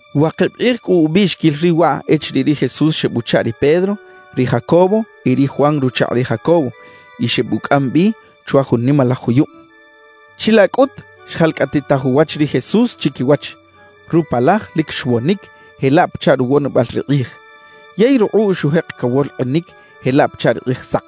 Wakib kꞌij cꞌu ubiꞌxiquil riꞌ waꞌ echiriꞌ ri Jesús xebuchaꞌ ri Pedro, ri Jacobo y ri Juan ruchakꞌ ri Jacobo; y xebucꞌam bi chwa jun nimalaj juyub. Chilaꞌ cꞌut xjalcꞌatitaj uwach ri Jesús chiquiwach. Rupalaj lic xwonic jelaꞌ pachaꞌ ruwonibal ri kꞌij; yey rukꞌuꞌ xujek cawolkꞌinic jelaꞌ pachaꞌ ri kꞌijsak.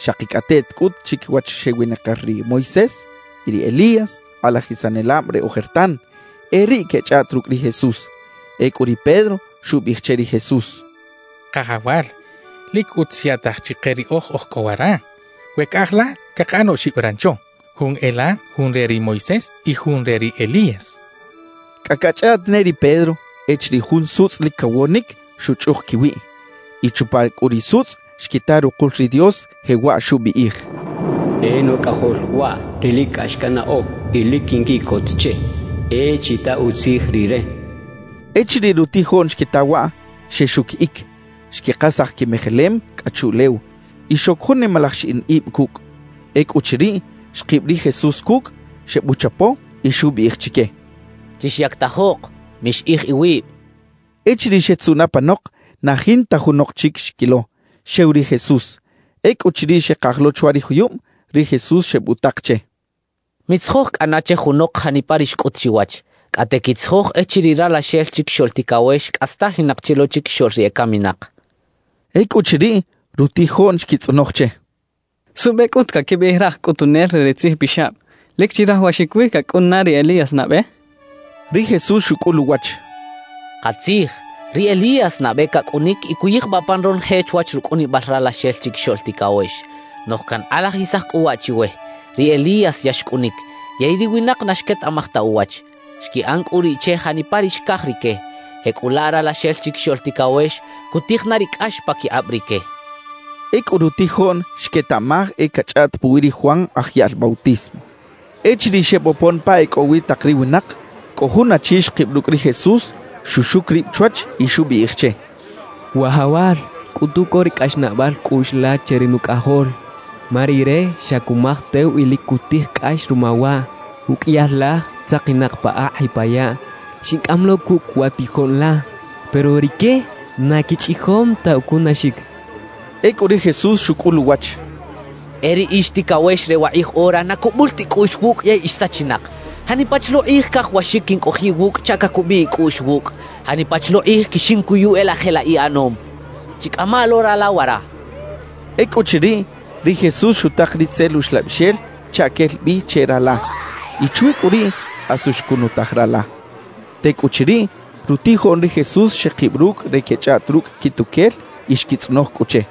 Xakicꞌateꞌt cꞌut chiquiwach xewinakir ri Moisés y ri Elías, kꞌalajisanelab re ojertan; e riꞌ quechꞌaꞌt rucꞌ ri Jesús. Ecꞌu ri Pedro xubiꞌij che ri Jesús: —Kajawal, lic utz xyaꞌtaj chike riꞌoj oj cꞌo wara. We caꞌaj la, cakaꞌan oxib rancho: jun e la, jun re ri Moisés y jun re ri Elías —xchaꞌ. Cꞌa cachꞌaꞌt ne ri Pedro echiriꞌ jun sutzꞌ lic cawonic xuchꞌuk quiwiꞌ. Y chupa cꞌu ri sutzꞌ xquita rukul ri Dios, jewaꞌ xubiꞌij: «E Nucꞌajol waꞌ ri lic cꞌax cannaꞌo y lic quinquiꞌcot che. E chita utzij Rire» xchaꞌ. Echiriꞌ rutijoꞌn xquita waꞌ, xexuquiꞌic, xquikasaj quimejelem cꞌa chuꞌlew y xoc jun nimalaj xiꞌin ib cucꞌ. Ecꞌuchiriꞌ, xkib ri Jesús cucꞌ, xebuchapo y xubiꞌij chique: —Chixyactajok, mixiꞌij iwib —xchaꞌ. Echiriꞌ xetzuꞌn apanok, na jinta junok chic xquilo, xew ri Jesús. Ecꞌuchiriꞌ xekaj lo chwa ri juyub, ri Jesús xebutak che: —Mitzijoj cꞌana che junok janipa ri xcꞌut chiwach, cꞌate quitzijoj echiriꞌ Ralaxel Chiquixoꞌl Ticawex cꞌastajinak chi lo chiquixoꞌl ri ecaminak —xchaꞌ. Ecꞌuchiriꞌ, rutijoꞌn xquitzꞌonoj che: —¿Suꞌbe cꞌut caquibiꞌij raj cꞌutunel re ri tzijpixab: “Lic chirajawaxic wi cacꞌun na ri Elías nabe”? —xechaꞌ. Ri Jesús xucꞌul uwach: —Katzij, ri Elías nabe cacꞌunic y cuyijbaꞌ pan ronoje chwach rucꞌunibal Ralaxel Chiquixoꞌl Ticawex. Noꞌj cankꞌalajisaj cꞌu waꞌ chiwe: Ri Elías ya xcꞌunic, yey ri winak na xquetaꞌmaj ta uwach. Xquiꞌan cꞌu riꞌ che janipa ri xcaj rique; jecꞌulaꞌ Ralaxel Chiquixoꞌl Ticawex cutij na ri cꞌax paquikꞌab rique —xchaꞌ. Ecꞌu rutijoꞌn xquetaꞌmaj e cachꞌaꞌt puwi ri Juan Aj Yaꞌl Bautismo. Echiriꞌ xebopon pa e cꞌo wi tak ri winak, cꞌo jun achi xkib rucꞌ ri Jesús, xuxuc rib chwach y xubiꞌij che: —Wajawal, cꞌutu co ri cꞌaxnaꞌbal cꞌuꞌx la che ri nucꞌajol, ma rire xa cumaj tew y lic cutij cꞌax ruma waꞌ; uqꞌuiyal laj tzakinak pa akꞌ y pa yaꞌ. Xincꞌam lo cucꞌ wa tijoꞌn la, pero rique na quichꞌijom ta ucunaxic —xchaꞌ. Ecꞌu ri Jesús xucꞌul uwach: —¡E ri ix ticawex re wakꞌij ora na cubul ta icꞌuꞌx wucꞌ yey ix sachinak! ¿Janipa chi lo kꞌij cajawaxic quincꞌojiꞌ iwucꞌ chaꞌ cacubiꞌ icꞌuꞌx wucꞌ? ¿Janipa chi lo kꞌij quixincuyu e laꞌ jelaꞌ iꞌanom? Chicꞌama lo rala wara —xchaꞌ. Ecꞌuchiriꞌ, ri Jesús xutak ri itzel uxlabixel chaꞌ quel bi che rala. Y chwi cꞌu riꞌ asu xcunutaj rala. Tecꞌuchiriꞌ, rutijoꞌn ri Jesús xekib rucꞌ re quechꞌaꞌt rucꞌ quituquel y xquitzꞌonoj cꞌu che: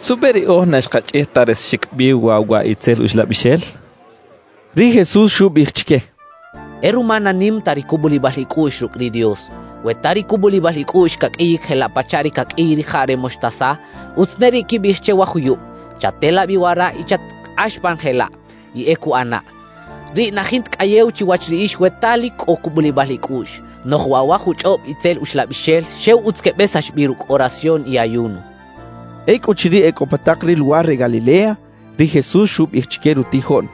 —¿Suꞌbe riꞌoj na xkachꞌij ta resaxic bi waꞌ wa itzel uxlabixel? —xechaꞌ. Ri Jesús xubiꞌij chique: —E ruma na nim ta ri cubulibal icꞌuꞌx rucꞌ ri Dios. We ta ri cubulibal icꞌuꞌx caqꞌuiyic jelaꞌ pachaꞌ ri caqꞌuiy rijaꞌ re moxtasa, utz ne riꞌ quibiꞌij che wa juyub: “Chatela bi wara y chatkꞌax pan jelaꞌ”, y e cuꞌanaꞌ. Riꞌ na jinta cꞌayew chiwach riꞌix we ta lic cꞌo cubulibal icꞌuꞌx. Noꞌj waꞌ wa juchꞌob itzel uxlabixel xew utz quebesax bi rucꞌ oración y ayuno —xchaꞌ. Ecꞌuchiriꞌ e cꞌo pa tak ri luwar re Galilea, ri Jesús xubiꞌij chique rutijoꞌn: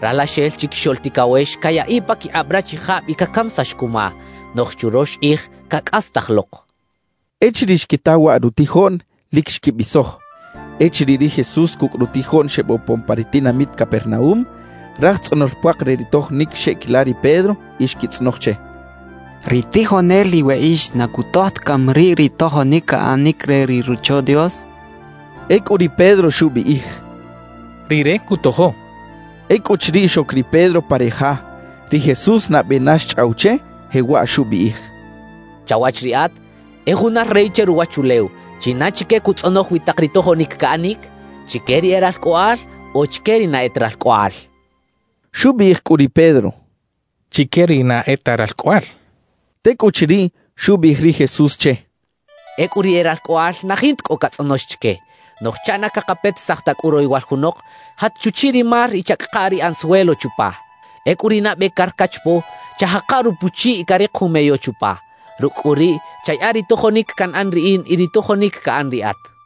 «Ralaxel Chiquixoꞌl Ticawex cayaꞌiꞌ paquikꞌab rachijab y cacamisax cuma; noꞌj churox kꞌij cacꞌastaj lok» xchaꞌ. Echiriꞌ xquita waꞌ rutijoꞌn, lic xquibisoj. Echiriꞌ ri Jesús cucꞌ rutijoꞌn xebopon pa ri tinamit Capernaúm, raj tzꞌonol puak re ri tojonic xeꞌquila ri Pedro y xquitzꞌonoj che: —¿Ri tijonel iweꞌix na cutoj ta cami riꞌ ri tojonic caꞌanic re ri Rocho Dios? —xechaꞌ. Ecꞌu ri Pedro xubiꞌij: —Rire cutojo —xchaꞌ. Ecꞌuchiriꞌ xoc ri Pedro pa ri ja, ri Jesús nabe na xchꞌaw che, jewaꞌ xubiꞌij: —Chawach riꞌat, ¿e juna rey che ruwachulew, china chique cutzꞌonoj wi tak ri tojonic caꞌanic? ¿Chique ri e ralcꞌoꞌal o chique ri na e ta ralcꞌoꞌal? —xchaꞌ. Xubiꞌij cꞌu ri Pedro: —Chique ri na e ta ralcꞌoꞌal —xchaꞌ. Tecꞌuchiriꞌ, xubiꞌij ri Jesús che: —Ecꞌu ri e ralcꞌoꞌal na jinta cꞌo catzꞌonox chique. Noꞌj chaꞌ na cakapetisaj ta cꞌu royowal junok, jat chuchiꞌ ri mar y chacꞌaka ri anzuelo chupa. Ecꞌu ri nabe car cachapo, chajaka rupuchiꞌ y carik jun meyo chupa. Rucꞌ cꞌu riꞌ, chayaꞌa ri tojonic canꞌan riꞌin y ri tojonic caꞌan riꞌat —xchaꞌ.